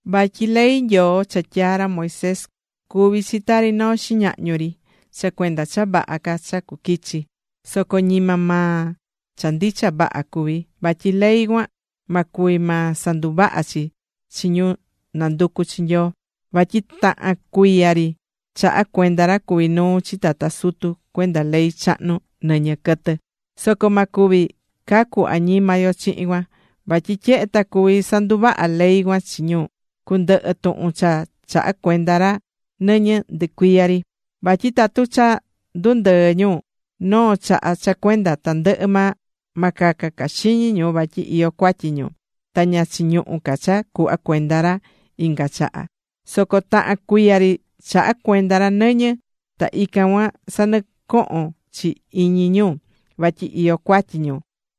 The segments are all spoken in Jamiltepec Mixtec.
Vatyi ley Nyoo cha tyaa̱ ra Moisés, cuví chi tari noo xiñahñu ri, cha cuenda cha vaha ca cha cuquichi. Soco ñima maa cha ndicha vaha cuví. Vatyi ley cuan, ma cuvi maa sanduvaha chi chi ñu nanducú chi Nyoo. Vatyi tahan cuiya ri chahá cuenda ra cuví nuu chi tata sutu cuenda ley chahnu nɨñɨ quɨtɨ. Soco ma cuvi cacu añima yo chihin cuan. Vatyi tyehe ta cuví sanduvaha ley cuan chi ñu, cundɨhɨ tuhun cha chahá cuenda ra nɨñɨ ndɨcuiya ri. Vatyi tatu cha ndundɨɨ̱ ñu noo chaha cha cuenda tandɨhɨ maa, ma caca ca xiñi ñu vatyi iyó cuatyi ñu ta ña chiñuhú ca cha cuhva cuenda ra inga chaha. Soco tahan cuiya ri chahá cuenda ra nɨñɨ, ta ican cuan sanɨcohón chi iñi ñu vatyi iyó cuatyi ñu.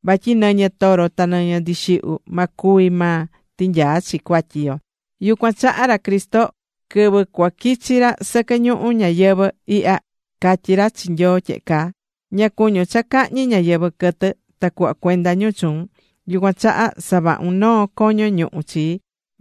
Vatyi nɨñɨ toro ta nɨñɨ ndixihyu, ma cuvi maa tinyaa chi cuatyi yo. Yucuan chaha ra Cristo, quɨvɨ cuaquichi ra sɨquɨ ñuhu ñayɨvɨ̱ ihya, catyi̱ ra chi Nyoo tyehe caa: Ña cuñún cha cahñi ñáyɨvɨ quɨtɨ ta cuhva cuenda ñu chuun, yucuan chaha savahu̱n noo coño ñuhu chii.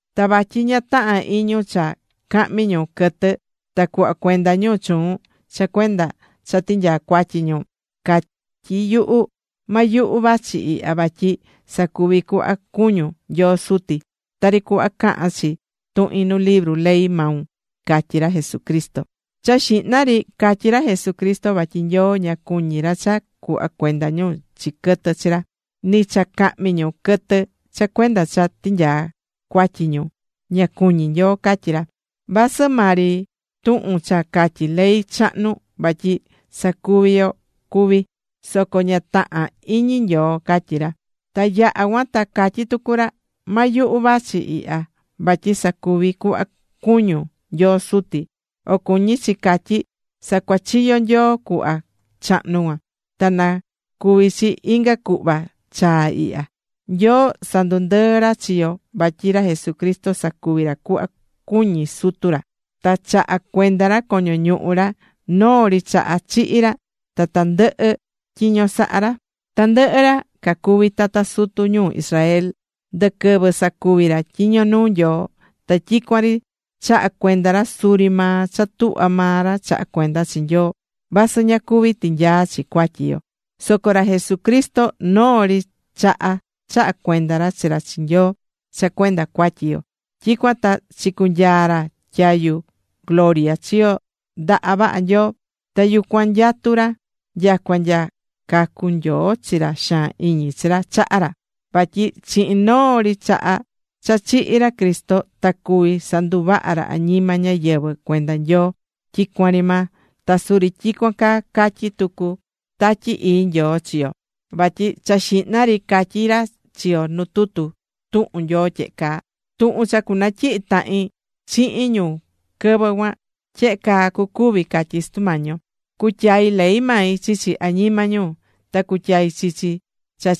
Ta vatyi ña tahán iñun cha cahmi ñu quɨtɨ ta cuhva cuenda ñu chuun cha cuenda cha tinyaa cuatyi ñu. Catyí yuhu: “Ma yuhu, vachi ihya vatyi sacuvi cuhva cuñún, Nyoo Suti, tari cuhva cahán chi tuhin nu libru ley maun”, catyí ra Jesucristo. Cha xihna ri, catyí ra Jesucristo vatyi Nyoo, ña cuñí ra cha cuhva cuenda ñu chi quɨtɨ chi ra. Ni cha cahmi ñu quɨtɨ cha cuenda cha tinyaa cuatyi ñu, ña cuñí Nyoo, catyí ra. Vasɨ maa ri tuhun cha catyí ley chahnu vatyi sacuví yo cuví, soco ña tahán iñi Nyoo, catyí ra. Ta yaha̱ cuan ta catyí tucu ra: “Ma yuhu vachi ihya, vatyi sacuvi cuhva cuñún, Nyoo Suti.” O cuñí chi catyí, sacuachiyo̱ Nyoo cuhva chahnu cuan, ta nacuvi chi inga cuhva chaa ihya. Nyoo sandundɨɨ̱ ra chi yo vatyi ra Jesucristo sacuvi̱ ra cuhva cuñi̱ Sutu ra, ta chaha̱ cuenda ra coño ñuhu ra. Noo ri chaha chihi̱ ra ta ndɨhɨ̱ tyiño saha̱ ra. Tandɨhɨ ra cacuví tata sutu ñuu Israel, ndɨ quɨvɨ sacuvi̱ ra tyiño nuu Nyoo, ta tyicuan ri chaha̱ cuenda ra suri maa cha tuhvá maa ra chahá cuenda chi Nyoo, vasɨ ña cuvi̱ tinyaa chi cuatyi yo. Soco ra Jesucristo, noo ri chaha chaha̱ cuenda ra chi ra chi Nyoo cha cuenda cuatyi yo. Tyicuan ta chicunyaa̱ ra tyayu gloria chiyo ndaha vaha Nyoo. Ta yucuan nyatú ra nyacua nya cacun Nyoo chi ra xaan iñi chi ra chaha ra. Vatyi chihin noo ri chaha cha chihi̱ ra Cristo ta cuvi̱ sanduvaha ra añima ñáyɨvɨ cuenda Nyoo, tyicuan ri maa. Ta suri tyicuan caa catyí tucu Tatyi Ii Nyoo chi yo. Vatyi cha xihna ri catyí ra chi yo nu tutu tuhun Nyoo tyehe caa: Tuhun cha cunatyihi tahin chihin ñu quɨvɨ cuan, tyehe caa cucuvi, catyí Sutu Mañi yo: Cutyai ley mai chichi añima ñu, ta cutyai chichi cha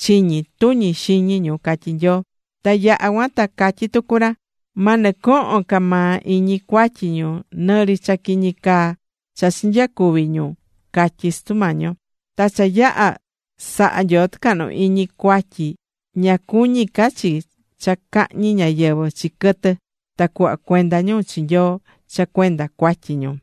chiñi tuñi xiñi ñu, catyí Nyoo. Ta yaha̱ cuan ta catyí tucu ra: Ma nɨcohon ca maa iñi cuatyi ñu, nɨri cha quiñi caa cha chinyacuvi̱ ñu, catyí Sutu Mañi yo. Ta cha yaha̱ saha̱ Nyoo tɨcahnu iñi cuatyi, ña cuñí ca chi cha cahñi ñáyɨvɨ chi quɨtɨ, ta cuhva cuenda ñu chi Nyoo cha cuenda cuatyi ñu.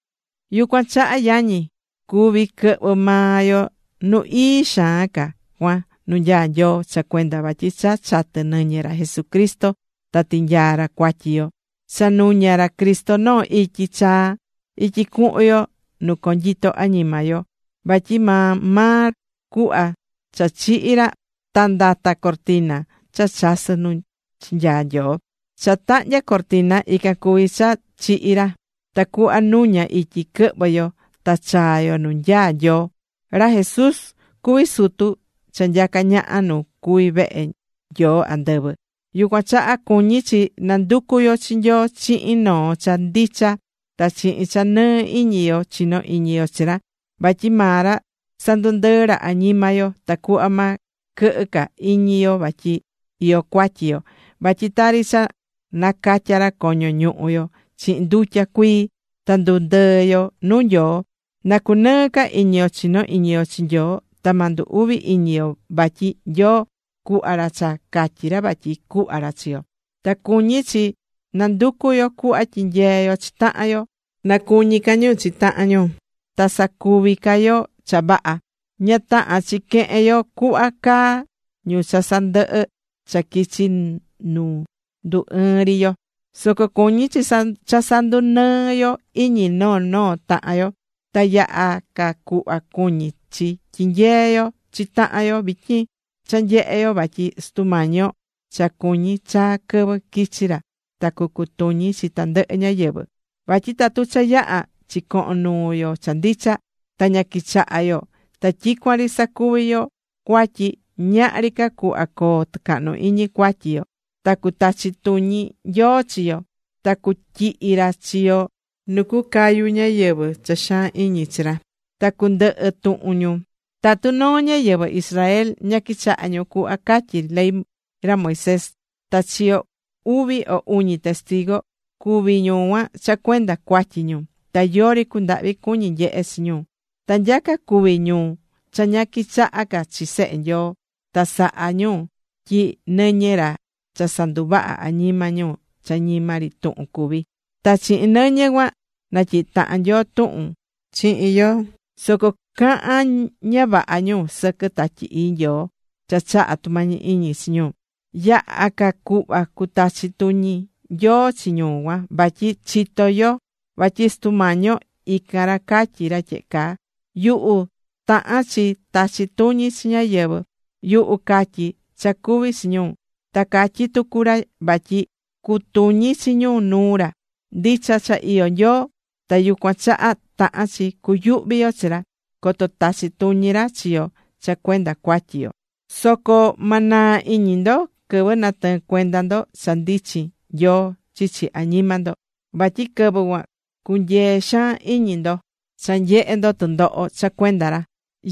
Yucuan chaha yañi, cuví quɨhvɨ maa yo Nu Ii Xaan Ca cuan nu nyaá Nyoo, cha cuenda vatyi cha chatɨ̱ nɨñɨ ra Jesucristo ta tinyaa̱ ra cuatyi yo. Cha nuña̱ ra Cristo noo ityi chaa, ityi cuhun yo nu conyito añima yo. Vatyi maa maa cuhva cha chihi̱ ra ta ndata̱ cortina cha chasɨ̱ nu chinyaa̱ Nyoo. Cha tahnya̱ cortina, ican cuví cha chihi̱ ra, tacuhva nuña ityi quɨhvɨ yo ta chaa yo nu nyaá Nyoo. Ra Jesús cuví sutu cha nyacá ñaha nu cuví vehe Nyoo andɨvɨ. Yucuan chaha cuñí chi nanducu yo chi Nyoo chihin noo cha ndicha ta chihin cha nɨɨ iñi yo chinó iñi yo chi ra, vatyi maa ra sandundɨɨ̱ ra añima yo, tacuhva ma quɨhɨ ca iñi yo vatyi iyó cuatyi yo, vatyi tari cha nacatya̱ ra coño ñuhu yo chihin ndutya cuii, na ndu ndɨɨ yo nu Nyoo. Na cunɨɨ ca iñi yo chino iñi yo chi Nyoo ta ma ndu uvi iñi yo vatyi Nyoo cuhva ra cha catyi ra vatyi cuhva ra chi yo. Ta cuñí chi nanducu yo cuhva tyinyee yo chi tahan yo, na cuñi ca ñu chi tahan ñu ta sacuvi ca ñu cha vaha. Ña tahán chi quehen yo cuhva caá ñu cha sandɨhɨ̱ cha quichi nu ndu ɨɨn ri yo, soco cuñí chi cha sandunɨɨ yo iñi noo noo tahan yo. Ta yaha ca cuhva cuñí chi tyinyee yo chi tahan yo vityin cha nyehé yo vatyi Sutu Mañi yo cha cuñí chaa quɨvɨ quichi ra ta cucutuñi chi tandɨhɨ ñáyɨvɨ. Vatyi tatu cha yaha̱ chicoho̱n nuu yo cha ndicha, ta ña quichahá yo ta tyicuan ri sacuví ca yo cuatyi, ñahri ca cuhva coo tɨcahnu iñi cuatyi yo. Ta cutachi tuñi Nyoo chi yo. Ta cutyihi ra chi yo nu cucayu ñáyɨvɨ cha xaan iñi chi ra, ta cundɨhɨ tuhun ñu. Tatu noo ñáyɨvɨ Israel ña quichaha̱ ñu cuhva catyí ley ra Moisés, ta chiyo̱ uvi o uñi testigu, cúvi ñu cuan cha cuenda cuatyi ñu, ta yori cundahvi cuñi̱ nyehe chi ñu. Ta nyaca cuví ñu cha ña quichaha ca chi Sehe Nyoo ta sahá ñu tyi nɨñɨ ra cha sanduvaha̱ añima ñu cha ñima ri tuhun cuví. Ta chihin nɨñɨ cuan natyihi̱ tahan Nyoo tuhun chihin yo. Soco cahán ña vaha ñu sɨquɨ Tatyi Ii Nyoo cha chahá tumañi iñi chi yo. Yaha ca cuhva cutachi tuñi Nyoo chi ñu cuan. Vatyi chitó yo vatyi Sutu Mañi yo, ican ra catyí ra tyehe caa: “Yuhu tahán chi tachi tuñi chi ñáyɨvɨ, yuhu catyí cha cuvi chi ñu.” Ta catyí tucu ra vatyi cutuñi chi ñu nuu ra. Ndicha cha iyó Nyoo, ta yucuan chaha tahán chi cuyuhvi yo chi ra, coto tachi tuñi ra chi yo cha cuenda cuatyi yo. Soco ma naa iñi ndo quɨvɨ natɨɨ̱n cuenda ndo cha ndichin Nyoo chichi añima ndo, vatyi quɨvɨ cuan cunyee̱ xaan iñi ndo cha nyehe̱ ndo tɨndoho cha cuenda ra.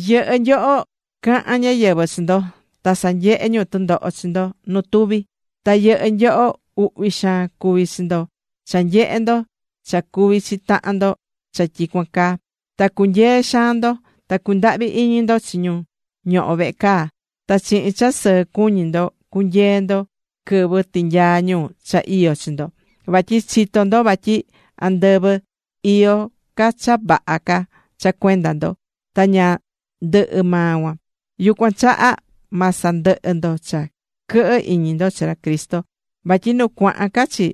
Yɨhɨ́ nyoho caha̱n ñáyɨvɨ chi ndo, ta sanyehe̱ ñu tɨndoho chi ndo nu tuvi. Ta yɨhɨ́ nyoho uhvi xaan cuvi̱ chi ndo cha nyehe̱ ndo cha cuvi̱ chi tahan ndo cha tyicuan caa, ta cunyee̱ xaan ndo. Ta cundahvi̱ iñi ndo chi ñu ñoho̱ vehe caa, ta chihin cha sɨɨ cuñí ndo cunyee̱ ndo quɨvɨ tinyaa̱ ñu cha iyó chi ndo, vatyi chitó ndo vatyi andɨvɨ iyó ca cha vaha ca cha cuenda ndo, ta ña ndɨhɨ́ maa cuan. Yucuan chaha ma sandɨhɨ ndo cha quɨhɨ iñi ndo chi ra Cristo, vatyi nu cuahan ca chi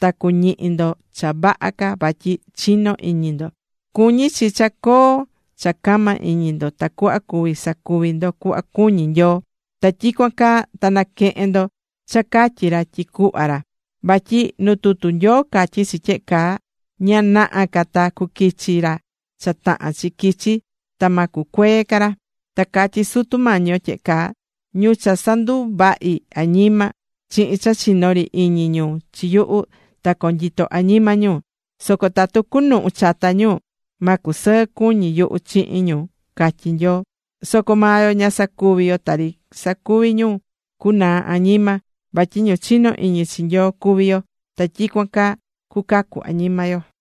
ta cuñihi ndo cha vaha ca vatyi chinó iñi ndo. Cuñí chi cha coo cha cama iñi ndo tacuhva cuví sacuvi ndo cuhva cuñí Nyoo, ta tyicuan caa ta naquehen ndo cha catyí ra tyi cuhva ra. Vatyi nu tutu Nyoo catyí chi tyehe caa: Ña naha ca ta cuquichi ra cha tahán chi quichi, ta ma cucuee ca ra. Ta catyí Sutu Mañi yo tyehe caa: “Ñu cha sanduvahi̱ añima, chihin cha chinó ri iñi ñu chi yuhu, ta conyito añima ñu. Soco tatu cunuhu chata ñu, ma cusɨɨ cuñi yuhu chihin ñu”, catyí Nyoo. Soco maa yo ña sacuví yo tari sacuví ñu cuanaá añima, vatyi ñu chinó iñi chi Nyoo cuví yo, ta tyicuan caa cucacu añima yo.